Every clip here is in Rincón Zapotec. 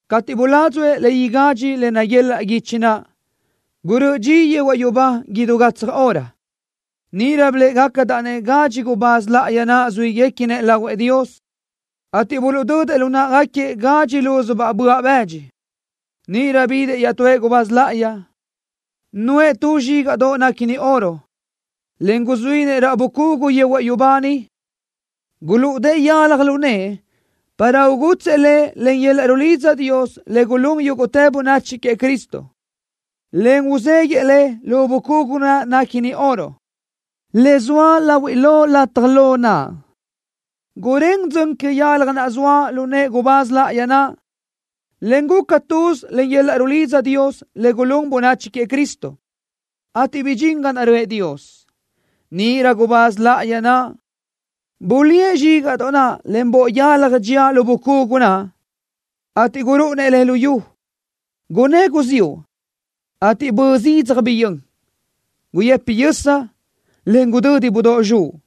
Cateʼ buládzuʼë le igadxi le naguelaʼ guichi naʼ, gurö́ʼö dxi yehuaʼ yubá idú gatsaj hora. Níʼirö biléʼegacadaʼ-nëʼ gadxi gubáz láʼayi naʼ zuíguequinëʼ lahuëʼ Dios, ateʼ buluʼdödëʼ lu náʼagaquiëʼ gadxi lúzubaʼ böaʼ bëdxi. Níʼirö bidëʼ iaʼtúëʼ gubáz láʼayi, nuʼë tu zxígaʼdoʼ néquini oro, en guzuínëʼ raʼ bucugu yehuaʼ yubá niʼ. Gulúʼudëʼë yalaj lu nëʼë para ugutsëʼ le len yöl-laʼ rulidza Dios le gulún yúguʼtë bönachi queëʼ Cristo, en uzéguiʼë le lu bucugu naʼ néquini oro, le zoa lahui lo lataj lo naʼ. Gurén dzön que yalaj naʼ zoa lu nëʼë gubáz láʼayi naʼ, en guca tuz len yöl-laʼ rulidza Dios le gulún bönachi queëʼ Cristo, ateʼ bidxín ga naʼ röʼë Dios. Níʼirö gubáz láʼayi naʼ bulíëʼ zxígaʼdoʼ naʼ len boʼ yalaj dxía lu bucugu naʼ, ateʼ gurúʼunëʼ le luyú. Gunnë́ guziúʼ, ateʼ bö zidzaj biyö́n. Guyëpi yösa, en gudödi budóʼ zxuʼ.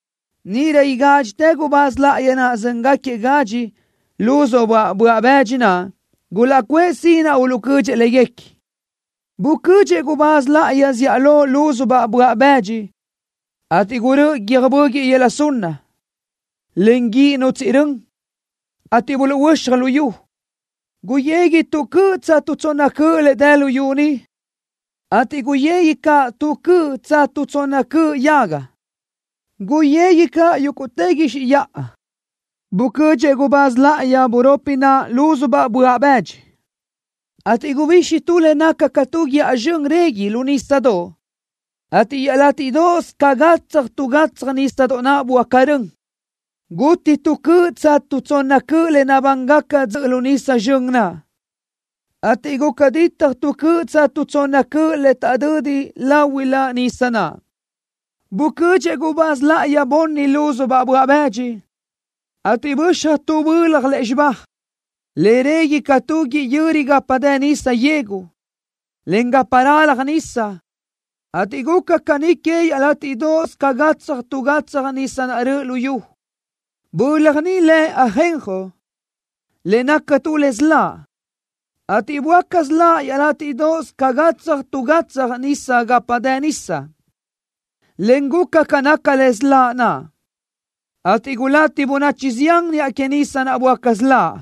Níʼirö igádxitëʼ gubáz láʼayi naʼ zö́ngaquiëʼ gadxi lúzubaʼ böaʼ bëdxi naʼ gulaʼcuʼë sinaʼ uluʼcödxëʼ léguequi. Bucödxëʼ gubáz láʼayi zíʼalö lúzubaʼ böaʼ bëdxi, ateʼ gurö́ʼö guiö́j böguiʼ yöla sunna, en guíʼ nutsíʼi rön, ateʼ buluʼhuöxaj luyú. Guyegui tu cöʼ tsa tu tsonna cöʼ le dë luyú ni, ateʼ guyegui caʼ tu cöʼ tsa tu tsonna cöʼ yaga. Guyegui caʼ yúguʼtë guixiʼ yaʼa. Bucödxëʼ gubáz láʼayi buropi naʼ lúzubaʼ böaʼ bëdxi, ateʼ gubixi tu le naca ca tu guíʼa zxön régui lu nísadoʼ, ateʼ iaʼlátiʼdoʼos ca gatsaj tu gatsaj nísadoʼ naʼ böáca rön. Guti tu cöʼ tsa tu tsonna cöʼ le nabángaca dzöʼö lu nisa zxön naʼ, ateʼ guca ditaj tu cöʼ tsa tu tsonna cöʼ le taʼdödi láhuiʼlö nisa naʼ. Bucödxëʼ gubáz láʼayi bunni lúzubaʼ böaʼ bëdxi, ateʼ böxaj tu bölaj lúzxiba, le régui ca tu guíʼ yöri gapa dë nisa yegu, encaʼ gapa ralaj nisa, ateʼ guca caní que iaʼlátiʼdoʼos ca gatsaj tu gatsaj nisa naʼ röʼö luyú. Bölaj ni lëbaʼ Ajenjo, le naca tu le siláʼ, ateʼ böáca siláʼ iaʼlátiʼdoʼos ca gatsaj tu gatsaj nisa gapa naʼ dë nisa, en guca ca naca le siláʼ naʼ, ateʼ gulati bönachi zián niʼa que nisa naʼ böáca siláʼ.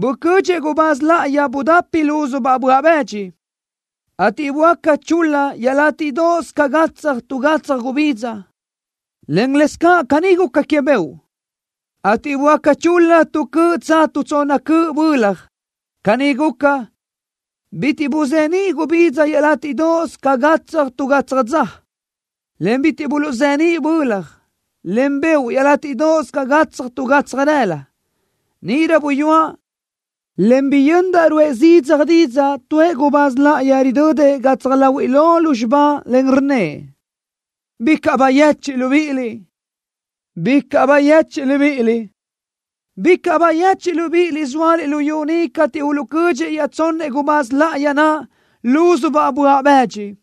Bucödxëʼ gubáz láʼayi budapi lúzubaʼ böaʼ bëdxi, ateʼ böáca chul-la iaʼlátiʼdoʼos ca gatsaj tu gatsaj gubidza, en lëscaʼ caní guca que beoʼ, ateʼ böáca chul-la tu cöʼ tsa tu tsonna cöʼ bölaj. Caní guca, bitiʼ buzeníʼ gubidza iaʼlátiʼdoʼos ca gatsaj tu gatsaj dza, en bitiʼ buluʼzeníʼ bölaj, en beoʼ iaʼlátiʼdoʼos ca gatsaj tu gatsaj rëla. Níʼirö buyúaʼ, en biyöndaʼ ruʼë zidzaj didzaʼ tuëʼ gubáz láʼayi ridödëʼ gatsaj láhuiʼlö lúzxiba, en rnnëʼ: “¡Bicaʼ bayechiʼ libíʼiliʼ! ¡Bicaʼ bayechiʼ libíʼiliʼ! ¡Bicaʼ bayechiʼ libíʼiliʼ zóaliʼ luyú ni cateʼ uluʼcödxëʼ iaʼtsonnëʼ gubáz láʼayi naʼ lúzubaʼ böaʼ bëdxi!”